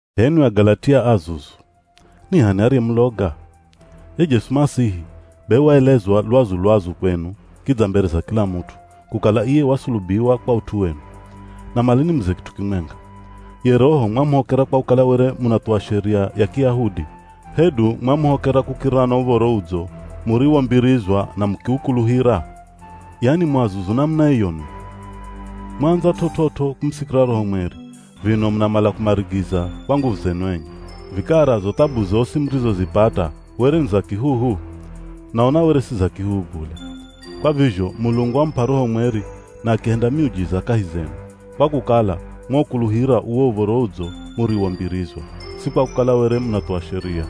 H'enwi Agalatia azuzu! Ni h'ani ariyemuloga? Ye Jesu Masihi, be waelezwa lwazu-lwazu kwenu kidza mbere za kila mut'u, kukala iye wasulubiwa kwa ut'u wenu. Namala nimuze kit'u kimwenga: Ye Roho, mwamuhokera kwa kukala were munathuwa Sheria ya Kiyahudi, hedu mwamuhokera kukirira na Uv̱oro Udzo muriwombirizwa na mukiukuluhira? Yani mu azuzu namuna iyo nwi? Mwaandza t'ot'ot'o kumusikira Roho Mweri, vino munamala kumarigiza kwa nguvu zenu enye? Vikara zo thabu zosi murizopata, were ni za kihuhu? Naona were si za kihuhu bule. Kwa vizho Mulungu wamup'a Roho Mweri na akihenda miujiza kahi zenu, kwa kukala mwaukuluhira uwo Uv̱oro Udzo muriwombirizwa, si kwa kukala were munathuwa Sheria.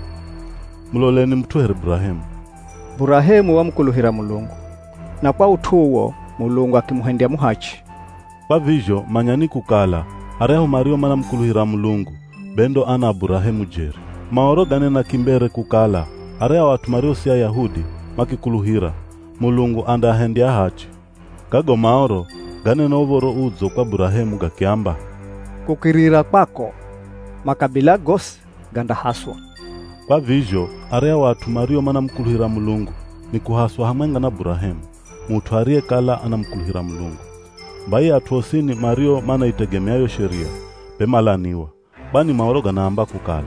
Muloleni mut'u here Burahemu, “Burahemu wamukuluhira Mulungu, na kwa ut'u uwo Mulungu akimuhendya muhachi.” Kwa vizho manyani kukala aryahu mario manamukuluhira Mulungu, be ndo ana a Burahemu jeri. Maoro ganena kimbere kukala aryahu at'u mario si Ayahudi, makikuluhira, Mulungu andaahendya ahachi. Gago Maoro ganena Uv̱oro Udzo kwa Burahemu gakiamba, “Kukirira kwako, makabila gosi gandahaswa.” Kwa vizho aryahu at'u mario manamukuluhira Mulungu, ni kuhaswa hamwenga na Burahemu, mut'u ariyekala anamukuluhira Mulungu. Bai at'u osini mario manaitegemea yo Sheria, be malaniwa. Kwani Maoro ganaamba kukala,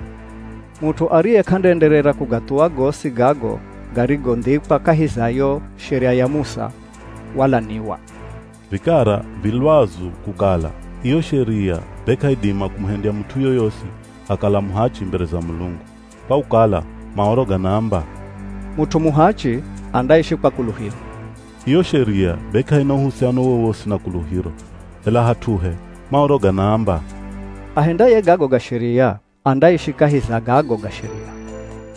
“Mut'u ariye k'andaenderera kugathuwa gosi gago garigondhikwa kahi za yo Sheria ya Musa, walaniwa.” Vikara vi lwazu kukala iyo Sheria be k'aidima kumuhendya mut'u yoyosi akakala muhachi mbere za Mulungu, kwa kukala Maoro ganaamba, “Mut'u muhachi andaishi kwa kuluhiro.” Iyo Sheria be k'aina uhusiano wowosi na kuluhiro. Ela hat'uhe Maoro ganaamba, “Ahendaye gago ga Sheria, andaishi kahi za gago ga Sheria.”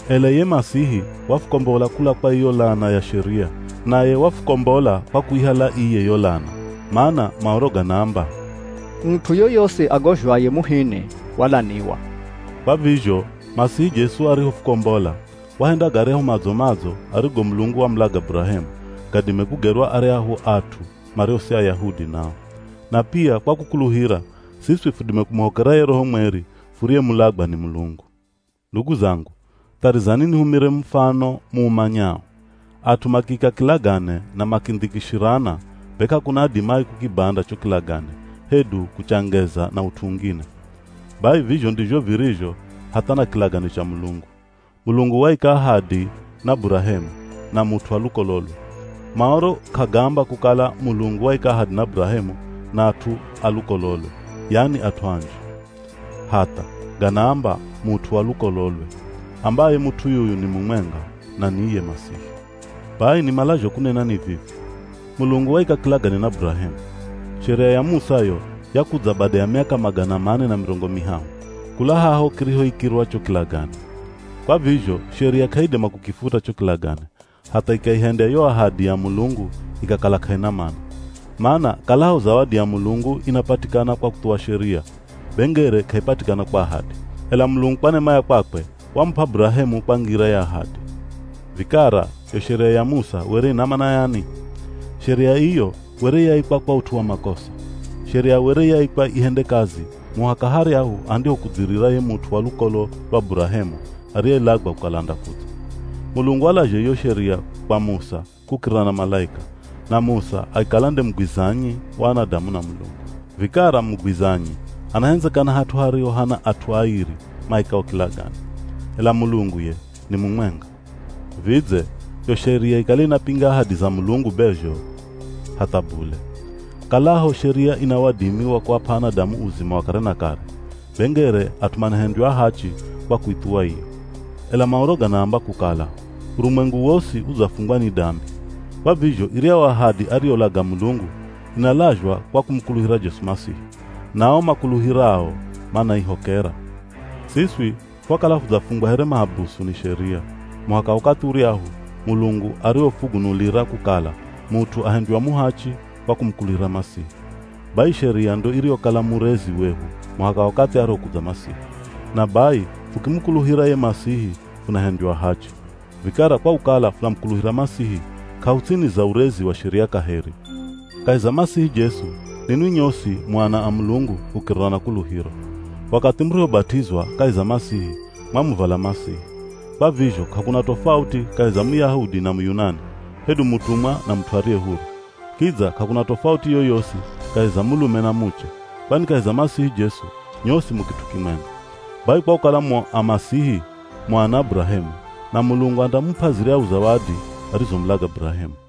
Ela iye Masihi wafukombola kula kwa iyo lana ya Sheria, naye wafukombola kwa kuihala iye yo lana. Mana Maoro ganaamba, “Mut'u yoyosi agozhwaye muhini, walaniwa.” Kwa vizho Masihi Jesu arihofukombola, wahenda garyahu madzo-madzo arigo Mulungu wamulaga Burahemu, gadime kugerwa aryahu at'u mario si Ayahudi nao. Na pia kwa kukuluhira, siswi fudime kumuhokera ye Roho Mweri furiyemulagwa ni Mulungu. Ndugu zangu, tharizani nihumire mufano muumanyao: At'u makiika kilagane na makindhikishirana, be k'akuna adimaye kukibanda cho kilagane, hedu kuchangeza na ut'u ungine. Bai vizho ndizho virizho hatha na kilagane cha Mulungu. Mulungu waika ahadi na Burahemu, na mut'u wa lukololwe. Maoro k'agaamba kukala Mulungu waika ahadi na Burahemu na at'u a lukololwe, yani at'u anji. Hatha. Ganaamba, “Mut'u wa lukololwe,” ambaye mut'u yuyu ni mumwenga, na ni iye Masihi. Bai nimalazho kunena ni vivi: Mulungu waika kilagane na Burahemu. Sheria ya Musa yo yakudza bada ya miaka magana mane na mirongo mihahu, kula haho kirihoikirwa cho kilagane. Kwa vizho Sheria k'aidima kukifuta cho kilagane, hatha ikaihendya yo ahadi ya Mulungu ikakala k'aina mana. Mana kalaho zawadi ya Mulungu inapatikana kwa kuthuwa Sheria, be ngere k'aipatikana kwa ahadi. Ela Mulungu kwa nema ya kwakwe wamup'a Burahemu kwa ngira ya ahadi. Vikara, yo Sheria ya Musa were ina mana yani? Sheria iyo were yaikwa kwa ut'u wa makosa. Sheria were yaikwa ihende kazi muhaka haryahu andihokudzirira ye mut'u wa lukolo lwa Burahemu ariyelagwa kukala andakudza. Mulungu walazha iyo Sheria kwa Musa kukirira na malaika, na Musa akikala nde mugwizanyi wa anadamu na Mulungu. Vikara mugwizanyi anahendzekana hat'u hariho hana at'u airi maikao kilagane. Ela Mulungu ye, ni mumwenga. Vidze, yo Sheria ikale inapinga ahadi za Mulungu be zho? Hatha bule! Kalaho Sheria ina wadimi wa kuap'a anadamu uzima wa kare na kare, be ngere at'u manahendywa ahachi kwa kuithuwa iyo. Ela Maoro ganaamba kukala urumwengu wosi udzafungwa ni dambi. Kwa vizho iryahu ahadi ariyolaga Mulungu, inalazhwa kwa kumukuluhira Jesu Masihi. Na ao makuluhirao manaihokera. Siswi fwakala fudzafungwa here mahabusu ni Sheria, muhaka wakathi uryahu Mulungu arihofugunulira kukala mut'u ahendywa muhachi kwa kumukuluhira Masihi. Bai Sheria ndo iriyokala murezi wehu muhaka wakathi arihokudza Masihi. Na bai fukimukuluhira ye Masihi funahendywa ahachi. Vikara kwa kukala funamukuluhira Masihi, k'ahuts'ini za urezi wa Sheria kaheri. Kahi za Masihi Jesu ninwi nyosi mu ana a Mulungu kukirira na kuluhiro. Wakathi murihobat'izwa kahi za Masihi, mwamuvala Masihi. Kwa vizho k'akuna tofauti kahi za Muyahudi na Muyunani, hedu mutumwa na mut'u ariye huru. Kidza k'akuna tofauti yoyosi kahi za mulume na muche, kwani kahi za Masihi Jesu, nyosi mu kit'u kimwenga. Bai kwa kukala mu a Masihi, mu ana a Burahemu, na Mulungu andamup'a ziryahu zawadi arizomulaga Burahemu.